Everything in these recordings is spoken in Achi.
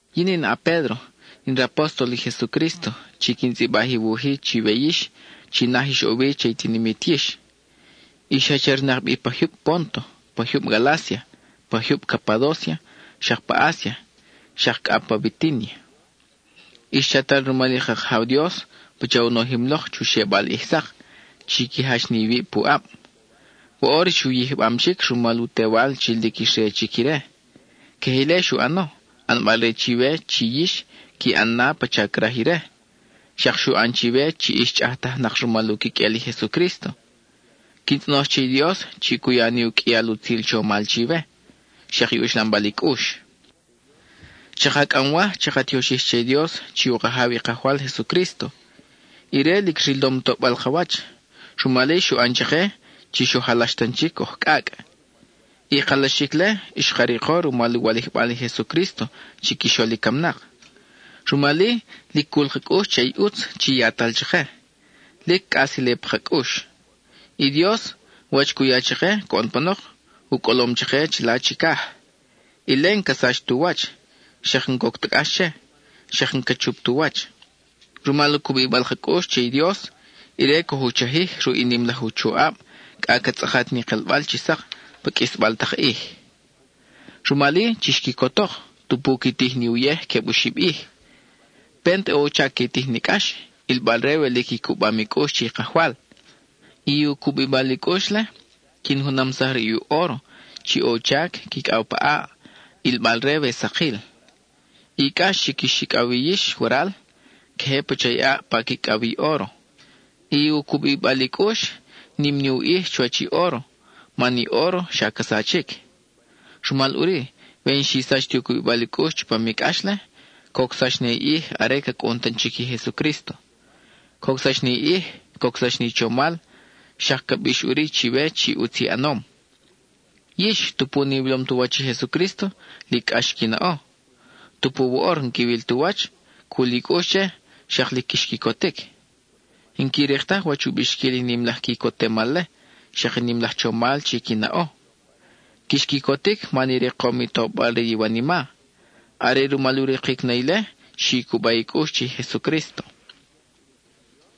Yin in a-Pédro, in rapóstol i Jesucrísto chi quin tzʼibaj i wuj-i chiwe yix chi naj ix ʼo wi che i tinimit yix. Ix jachernak bi pa jyub Pónto, pa jyub Galácia, pa jyub Capadócia, xak pa Asia, xak cʼa pa Bitínia. Ix chatal rumal i ka Kajaw Dios pacha u nojim lok chu xebal ʼij sak, chi qui jach ni iwib puʼab. Woʼor ix u yijbam chic rumal u Tewal chi lic ix re chic ire. Queje ile xu ʼano, ʼanbal-re chiwe chi yix qui ʼan na pacha craj ire, xak xu ʼan chiwe chi ix chʼajtajnak rumal u quiqʼuel i Jesucrísto. Quin tzʼonoj che i Dios chi cu ya ni u qʼuial utzil chomal chiwe, xak i uxlambal i cʼux. Chʼaka cʼamwaj chaka tioxij che i Dios chi u Kajaw i Kajwal Jesucrísto. Ire lic rilom toʼbal ka wach, rumal-i, xu ʼan chake chi xoj alax tan chic oj cʼacʼ. I kalaxic-le xka riko rumal u walijbal i Jesucrísto chiquixol i camnak. Rumal-i, lic cul ka cʼux che i ʼutz chi yatal chake; lic cʼas ile pa ka cʼux. I Dios, wach cu ya chake coʼon panok, u cʼolom chake chila chicaj; ile, n-ca sach tu wach, xak n-coc ta cʼax che, xak n-ca chup tu wach. Rumal u cubibal ka cʼux che i Dios, ire coj u chajij ruʼ i nim laj u choʼab cʼa ca tzʼakat ni kelbal chi sak pa qʼuisbal tak ʼij. Rumal-i, chix quicotok, tupu qui tij ni uyej queb oxib ʼij. Pent ʼo u chac qui tij ni cʼax, ʼilbal-re we lic i cubam i cʼux che i Kajwal. I u cubibal i cʼux-le, quin junamsaj ruʼ i óro chi ʼo u chac quicʼaw pa ʼaʼ, ʼilbal-re we sakil. I cʼax chi quix icʼaw wi yix waral, queje pacha i ʼaʼ pa quicʼaw wi i óro. I u cubibal i cʼux, nim ni u ʼij chuwach i óro, man i óro xa ca sachic. Rumal ʼuri, we n-xi sach ti u cubibal i cʼux chupam i cʼax-le, cocsax na i ʼij are ca cʼun tan chic i Jesucrísto. Cocsax na i ʼij, cocsax na i chomal, xak ca bix ʼuri chiwe chi ʼutz i ʼanom. Yix, tupu n-iwilom tu wach i Jesucrísto, lic cʼax qui naʼo; tupu woʼor n-quiwil tu wach, cul i cʼux che, xak lic quix quicotic. N-qui rik taj wach u bixquil i nim laj quicotemal-le, xak i nim laj chomal chi qui naʼo. Quix quicotic man i rikom i tobal re i iwanima; are rumal u rikic na ile xi cuba i cʼux che i Jesucrísto.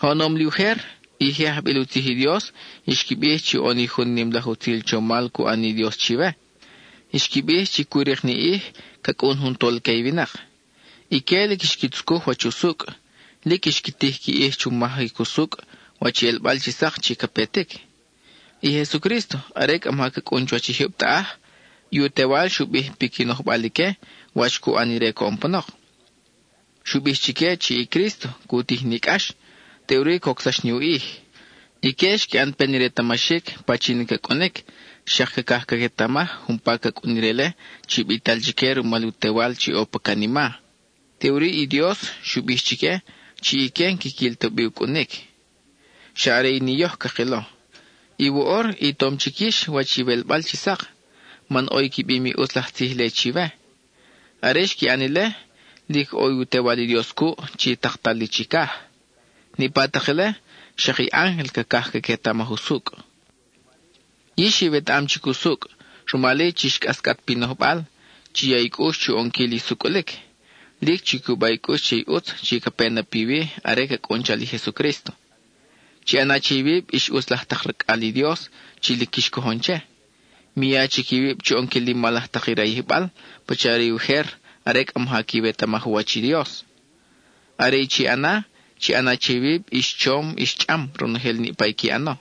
Oʼonom li ujer, i je ajbil u tzij i Dios xqui bij chi ʼo ni jun nim laj utzil chomal cu ʼan ni Dios chiwe; xqui bij chi cu rik ni ʼij, ca cʼun jun Tolque i winak. Ique lic xqui tzucuj wach usucʼ; lic xqui tij qui ʼij chu majic usucʼ wach i ʼelbal chi sak chi ca petic. I Jesucrísto, are cʼa maja ca cʼun chuwach i jyub taʼaj, i u Tewal xu bij piqui nojbal ique wach cu ʼan ire coʼon panok. Xu bij chique chi i Crísto cu tij ni cʼax, teʼuri cocsax ni u ʼij. Ique xqui ʼan pen i retamaxic pachin i ca cʼunic xak cacaj caquetamaj umpa ca cʼun ire-le chi bital chique rumal u Tewal chi ʼo pa canima. Teʼuri i Dios xu bij chique chi ique n-quiquil ta bi u cʼunic, xa are ni yoj cakilo. Y woʼor i tom chic yix wach iwelbal chi sak, man ʼo i qui bim i ʼutz laj tzij-le chiwe. Are xqui ʼan ile, lic ʼo i u Tewal i Dios cuʼ chi taktal li chicaj. Niʼpa tak ile, xak i ángel cacaj caquetamaj usucʼ. Yix iwetaʼam chic usucʼ, rumal-i chix cʼascʼat pi nojbal, chi ya i cʼux chu ʼonquil i sucʼulic. Lic chi cuba i cʼux che i ʼutz chi ca pe na piwi are ca cʼun chal i Jesucrísto. Chi ʼana che iwib ix ʼutz laj tak racʼal i Dios chi lic quix cojon che; mi ya chic iwib chu ʼonquil i mal laj tak i rayijbal pacha re ujer are cʼa maja quiwetamaj u wach i Dios. Are i chi ʼana, chi ʼana che iwib ix chom ix chʼam, ronojel niʼpa i qui ʼano,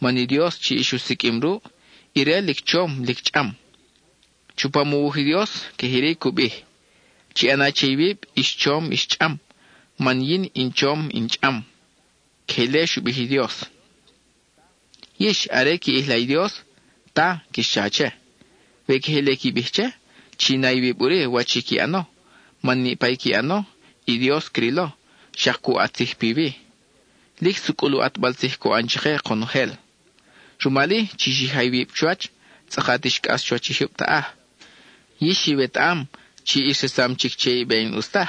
man i Dios chi ix u siqʼuim ruʼ, ire lic chom lic chʼam. Chupam u wuj i Dios, queje iri cu bij; “Chi ʼana che iwib ix chom ix chʼam, man yin in chom in chʼam.” (Queje ile xu bij i Dios.) Yix, are qui ʼijla i Dios, “Ta” quix cha che. We queje ile qui bij che, chi na iwib ʼuri wach i qui ʼano, man niʼpa i qui ʼano, i Dios crilo, xak cu ʼat tzij piwi; lic sucʼul u ʼatbal tzij cu ʼan chake konojel. Rumal-i, chi xija iwib chuwach, tzʼakat ix cʼas chuwach i jyub taʼaj. Yix iwetaʼam chi ix resam chic che i be n-ʼus taj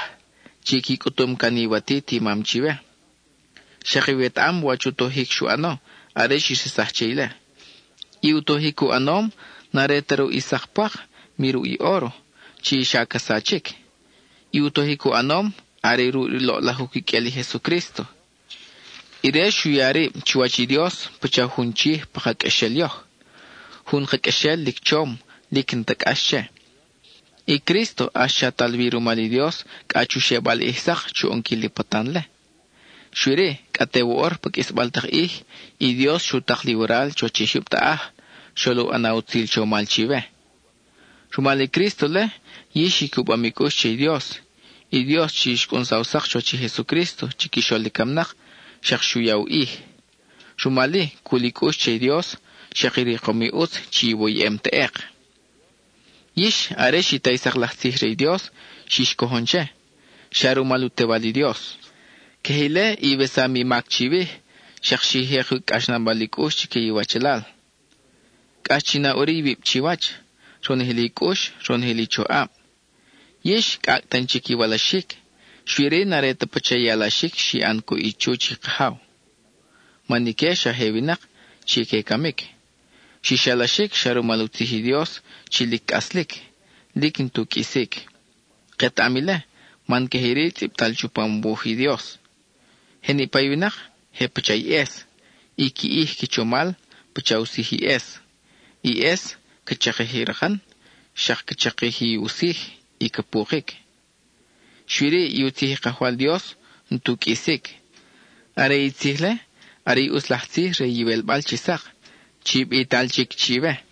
chi qui cʼutum can iwatit i mam chiwe. Xak iwetaʼam wach u tojic xu ʼano are xix resaj che ile. I u tojic xu ʼanom n-are ta ruʼ i sak pwak, mi ruʼ i óro, chi xa ca sachic. I u tojic u ʼanom, are ruʼ i loʼlaj u quiqʼuel i Jesucrísto. Ire xu ya rib chuwach i Dios pacha jun chij pa ka qʼuexel yoj, jun ka qʼuexel lic chom, lic n-ta cʼax che. I Crísto ʼax chatal wi rumal i Dios cʼa chu xebal ʼij sak chu ʼonquil i patan-le. Xui-ri, cʼa te woʼor pa qʼuisbal tak ʼij, i Dios xu tak li waral chuwach i jyub taʼaj, xol u ʼana utzil chomal chiwe. Rumal i Crísto-le, yix i cubam i cʼux che i Dios, i Dios chi xcʼunsaw sak chuwach i Jesucrísto chiquixol i camnak, xak xu ya u ij. Rumal-i, cul i cʼux che i Dios, xak i rikom i ʼutz chi iwoyʼem teʼek. Yix, are xi ta i sak laj tzij re i Dios, xix cojon che, xa rumal u Tewal i Dios. Queje ile, iwesam i mac chiwij, xak xi jek u cʼaxnabal i cʼux chique i iwachalal. Cʼax chi na ʼuri iwib chiwach, ronojel i cʼux, ronojel i choʼab. Yix, cʼacʼ tan chic iwalaxic, xui-ri n-are ta pacha i alaxic xi ʼan cuʼ i chuch i kajaw, man ique xa je winak chi que camic. Xix alaxic xa rumal u tzij i Dios chi lic cʼaslic, lic n-tu qʼuisic. Ketaʼam ile, man queje iri tzʼibtal chupam u wuj i Dios: Je niʼpa i winak, je pacha i ʼes, i qui ʼij qui chomal, pacha u sij i ʼes. I ʼes ca chakij i rakan, xak ca chakij u sij y ca pukic; xui-ri, i u tzij i Kajwal Dios n-tu qʼuisic. Are i tzij-le, are i ʼutz laj tzij re iwelbal chi sak, chi bital chic chiwe.